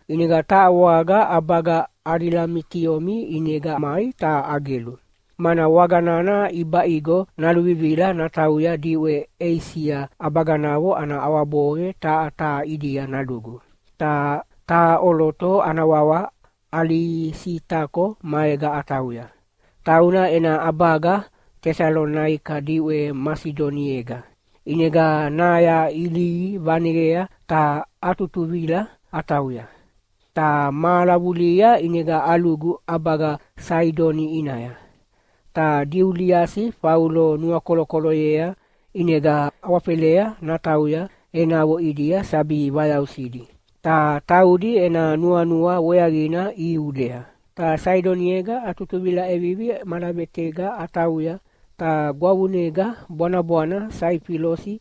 ʼInega taha waga ʼabaga Adilamitiomi ʼinega mai ta agelu, mana waga nana ʼibaʼigo naluvivila natauya diʼwe Eisia ʼabaganavo ana ʼawaboqe taha taha ʼidia nalugu. Ta taha ʼoloto ana wawa Alisitako maega atauya. Tauna ena ʼabaga Tesalonaika diʼwe Masidoniega. ʼInega naya ilihi vaneyea ta atutuvila atauya. Ta mahala vulihia ʼinega alugu ʼabaga Saidoni ʼinaya. Ta Diuliasi Faulo nuakolokoloyea ʼinega awafelea natauya enavo ʼidia sabi vayausidi, ta taudi ena nuanua weaqina ihiulea. Ta Saidoniega atutuvila ʼevivi malavetega atauya, ta gwavunega bwanabwana Saifilosi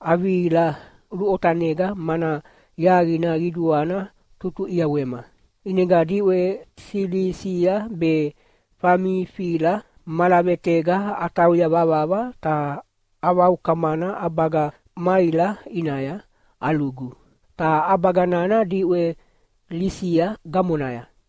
avihila luʼotanega mana yaqina qiduana tutuʼiawema. ʼInega diʼwe Silisia be Famifila malavetanega atauya vavava ta avaukamana ʼabaga Maila ʼinaya alugu, ta ʼabaga nana diʼwe Lisia gamonaya.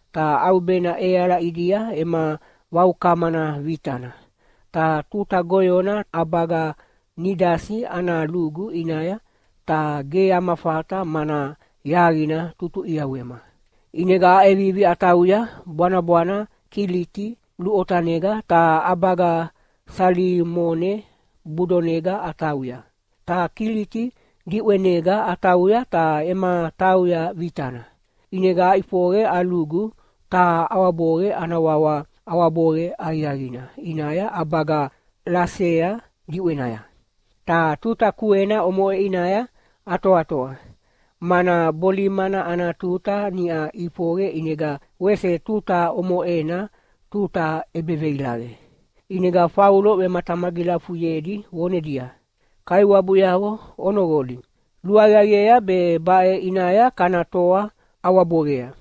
Ta ʼaubena ʼeala ʼidia ema vaukamana vitana, ta tuta goyona ʼabaga Nidasi ana lugu ʼinaya, ta ge ama fata mana yaqina tutuʼiawema. ʼInega aʼevivi atauya bwanabwana Kiliti luʼotanega ta ʼabaga Salimone budonega atauya. Ta Kiliti diʼwenega atauya ta ema tauya vitana. ʼInega aʼifoqe alugu taha ʼawaboqe ana wawa ʼAwaboqe Aqiaqina ʼinaya ʼabaga Lasea diʼwenaya. Ta tuta kuena omoʼe ʼinaya atoatoa, mana bolimana ana tuta niʼa ʼifoqe ʼinega wese tuta omoʼena tuta ʼebeveilaqe. ʼInega Faulo vematamagilafuyedi vonedia, “Kaiwabuyavo onoqoli! Luaqiaqiea be baʼe ʼinaya kana toa ʼawaboqea.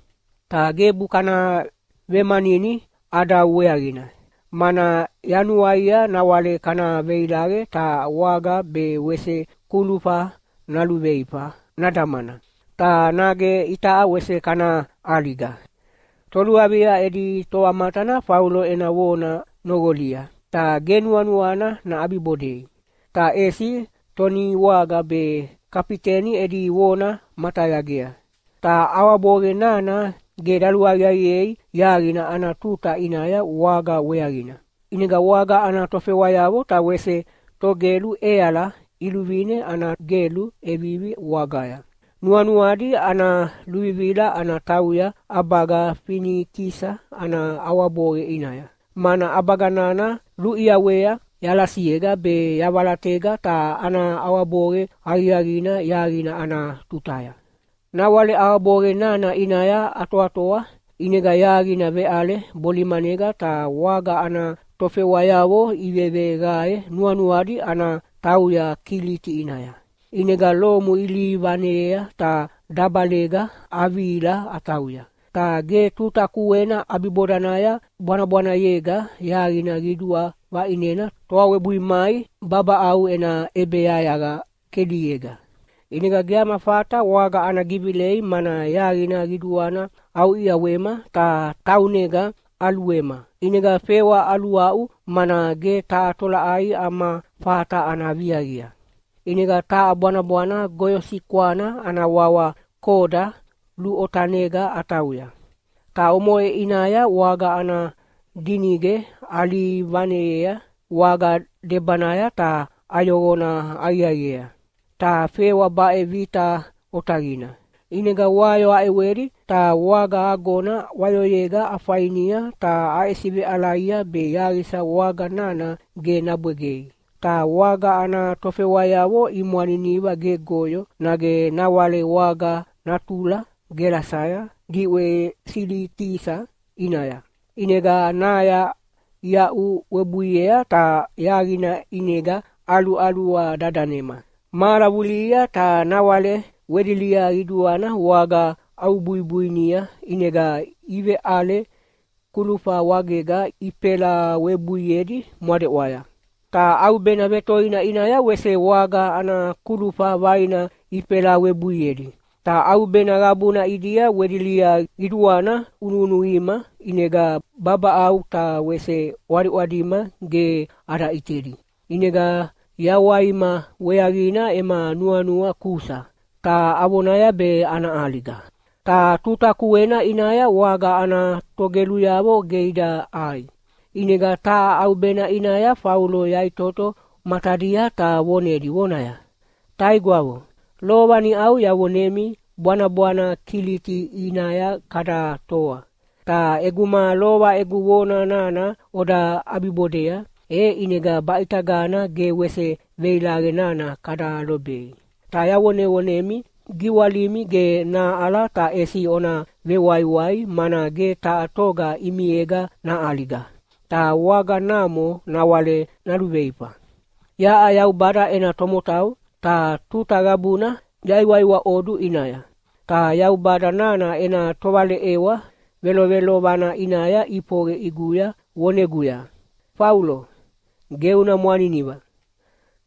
Ta gebu kana vemanini ʼadau weaqina, mana yanuaia nawale kana veilaqe ta waga be wese kulufa naluveifa nadamana, ta nage itaʼa wese kana ʼaliga.” Toluavia edi tovamatana Faulo ena vona noqolia, ta ge nuanuana naʼabibodei. Ta ʼesi toniwaga be kafiteni edi vona matayagea. Ta ʼawaboqe nana ge daluaqiaqiei yaqina ana tuta ʼinaya waga weaqina. ʼInega waga ana tofewayavo ta wese togelu ʼeala iluvine ana gelu ʼevivi wagaya. Nuanuadi ana luvivila ana tauya ʼabaga Finikisa ana ʼawaboqe ʼinaya, mana ʼabaga nana luʼiawea yalasiega be yavalatayega ta ana ʼawaboqe aqiaqina yaqina ana tutaya. Nawale ʼawaboqe nana ʼinaya atoatoa, ʼinega yaqina veʼale bolimanega ta waga ana tofewayavo iveveqae nuanuadi ana tauya Kiliti ʼinaya. ʼInega lomu ilihi vaneyea ta dabalega avihila atauya. Ta ge tuta kuena ʼabibodanaya bwanabwanayega yaqina qidua vaʼinena toa webui mai babaʼau ena ʼebeyayaqa kelinega. ʼInega ge ama fata waga ana givilei mana yaqina qiduana ʼauʼiawema ta taunega ʼaluema, ʼinega fewa aluaʼu mana ge taha tolaʼai ama fata ana viaqia. ʼInega taha bwanabwana goyosikwana ana wawa Koda luʼotanega atauya. Ta omoʼe ʼinaya waga ana dinige alihi vaneyea waga debanaya ta ayoqona aqiaqiea. Ta fewa baʼe vita otaqina. ʼInega wayo aʼewedi ta waga agona wayoyega afainia ta aʼesiveʼalaia be yaqisa waga nana ge nabwegei. Ta waga ana tofewayavo imwaniniva gegoyo nage nawale waga natula gelasaya diʼwe Silitisa ʼinaya. ʼInega naya iaʼu webuiea ta yaqina ʼinega ʼaluʼalua dadanema. Mahala vulihia ta nawale wedilia qiduana waga ʼaubuibuinia ʼinega iveʼale kulufa wagega ifelawebuiedi mwadeʼwaya. Ta ʼaubena vetoina ʼinaya wese waga ana kulufa vaina ifelawebuiedi. Ta ʼaubena qabuna ʼidia wedilia qiduana vunuvunuqima ʼinega babaʼau ta wese ʼwadiʼwadima ge ada ʼitedi. ʼInega yawaima weaqina ema nuanua kusa, ta avonaya be ana ʼaliga. Ta tuta kuena ʼinaya waga ana togeluyavo ge ida ʼai. ʼInega taha ʼaubena ʼinaya Faulo yaʼitoto matadia ta vonedi vonaya, “Taigwavo, lova niʼau yavonemi bwanabwana Kiliti ʼinaya kada toa. Ta ʼeguma lova egu vona nana oda ʼabibodea, e ʼinega baʼitagana ge wese veilaqe nana kada lobei. Ta yavonevonemi giwalimi ge nahaʼala ta ʼesi ona vewaiwai mana ge taha toga ʼimiega naʼaliga, ta waga namo nawale naluveifa. Yaʼa Yaubada ena tomotau, ta tuta qabuna yaiwaiwaʼodu ʼinaya. Ta Yaubada nana ena tovaleʼewa velovelovana ʼinaya ʼifoqe ʼiguya voneguya, ‘Faulo, ge una mwaniniva!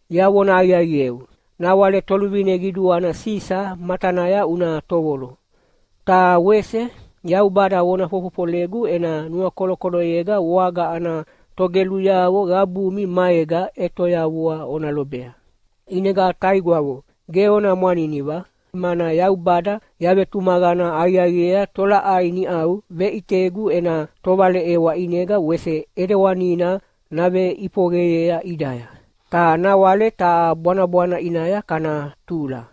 Yavona aqiaqieu, nawale toluvine qiduana Sisa matanaya una tovolo.’ Ta wese Yaubada vona fofofolegu ena nuakolokoloyega waga ana togeluyavo qabumi maega ʼetoyavua ona lobea. ʼInega taigwavo, ge ona mwaniniva, mana Yaubada yavetumaqana aqiaqiea tolaʼai niʼau veʼitegu ena tovaleʼewa ʼinega wese ʼidewanina naveʼifoqeyea ʼidaya. Ta nawale taha bwanabwana ʼinaya kana tula.”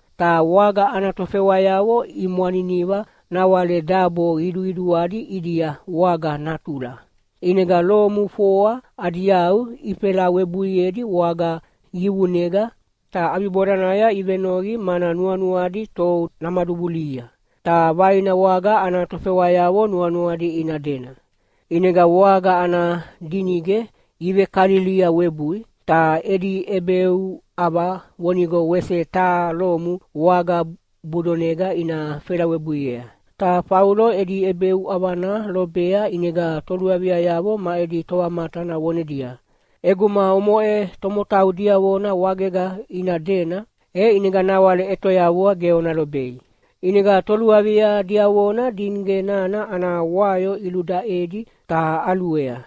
Ta waga ana tofewayavo imwaniniva nawale dabo qiduqiduadi ʼidia waga natula. ʼInega lomu foa adi yau ifelawebuiedi waga yiqunega, ta ʼabibodanaya ivenoqi mana nuanuadi tou namaduvulihia. Ta vaina waga ana tofewayavo nuanuadi ina dena. ʼInega waga ana dinige ivekalilia webui, ta edi ʼebeuʼava vonigo wese taha lomu waga budonega ina felawebuiea. Ta Faulo edi ʼebeuʼavana lobea ʼinega toluaviayavo ma edi tovamatana vonedia, “ʼEguma omoʼe tomotau diavona wagega ina dena, e ʼinega nawale ʼetoyavua ge ona lobei.” ʼInega toluavia diavona dinige nana ana wayo iludaʼedi ta ʼaluea.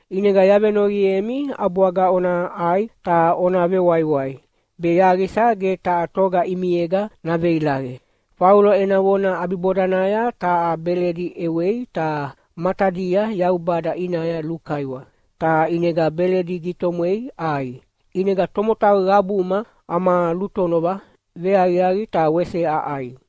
ʼInega yavenoqiemi ʼabwaga ona ʼai ta ona vewaiwai, be yaqisa ge taha toga ʼimiega naveilaqe.” Faulo ena vona ʼabibodanaya taha beledi ʼewei ta matadia Yaubada ʼinaya lukaiwa, ta ʼinega beledi gitomwei ʼai. ʼInega tomotau qabuma ama lutonova veaqiaqi ta wese aʼai.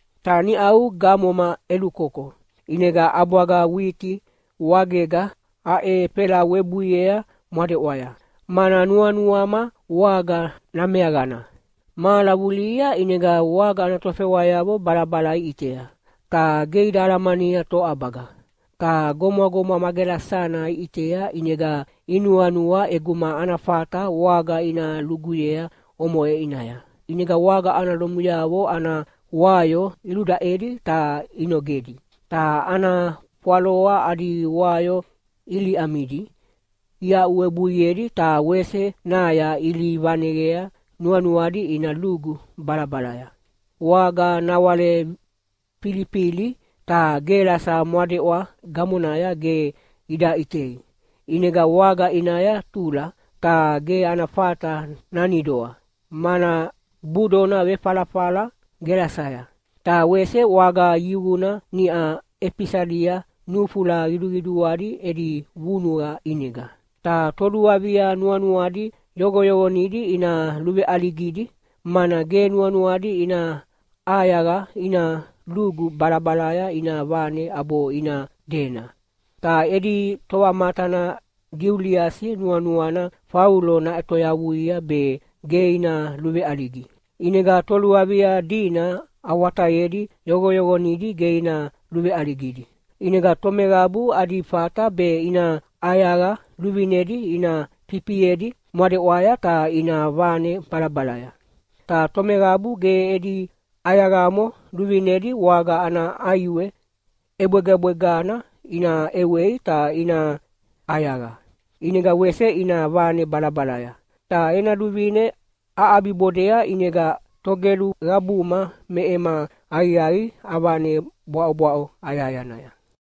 Ta niʼau gamoma ʼelukoko, ʼinega ʼabwaga witi wagega aʼefelawebuiea mwadeʼwaya, mana nuanuama waga nameaqana. Mahala vulihia ʼinega waga ana tofewayavo balabala iʼitea, ta ge ida alamania toʼabaga. Ta gomwagomwa ma gelasana iʼitea ʼinega inuanua ʼeguma ana fata waga ina luguyea omoʼe ʼinaya. ʼInega waga ana lomuyavo ana wayo iludaʼedi ta inogedi, ta ana fwaloa adi wayo iliʼamidi iaʼuwebuiedi ta wese naya ilihi vaneqea nuanuadi ina lugu balabalaya. Waga nawale filifili, ta gelasa mwadeʼwa gamonaya ge ida ʼitei, ʼinega waga ʼinaya tula ta ge ana fata nanidoa, mana budona vefalafala gelasaya. Ta wese waga yiquna niʼa ʼefisalia nufula qiduqiduadi edi vunuqa ʼinega. Ta toluavia nuanuadi yoqoyoqonidi ina luveʼaligidi, mana ge nuanuadi ina ʼayaqa ina lugu balabalaya ina vane ʼabo ina dena. Ta edi tovamatana Diuliasi nuanuana Faulo naʼetoyavuia be ge ina luveʼaligi. ʼInega toluavia dina awatayedi yoqoyoqonidi ge ina luveʼaligidi. ʼInega tomeqabu adi fata be ina ʼayaqa luvinedi ina fifiedi mwadeʼwaya ta ina vane balabalaya. Ta tomeqabu ge edi ʼayaqamo luvinedi waga ana ʼaiwe ʼebwegabwegana ina ʼewei ta ina ʼayaqa, ʼinega wese ina vane balabalaya. Ta ena luvine aʼabibodea ʼinega togelu qabuma me ema aqiaqi avane bwaʼobwaʼo ayahayanaya.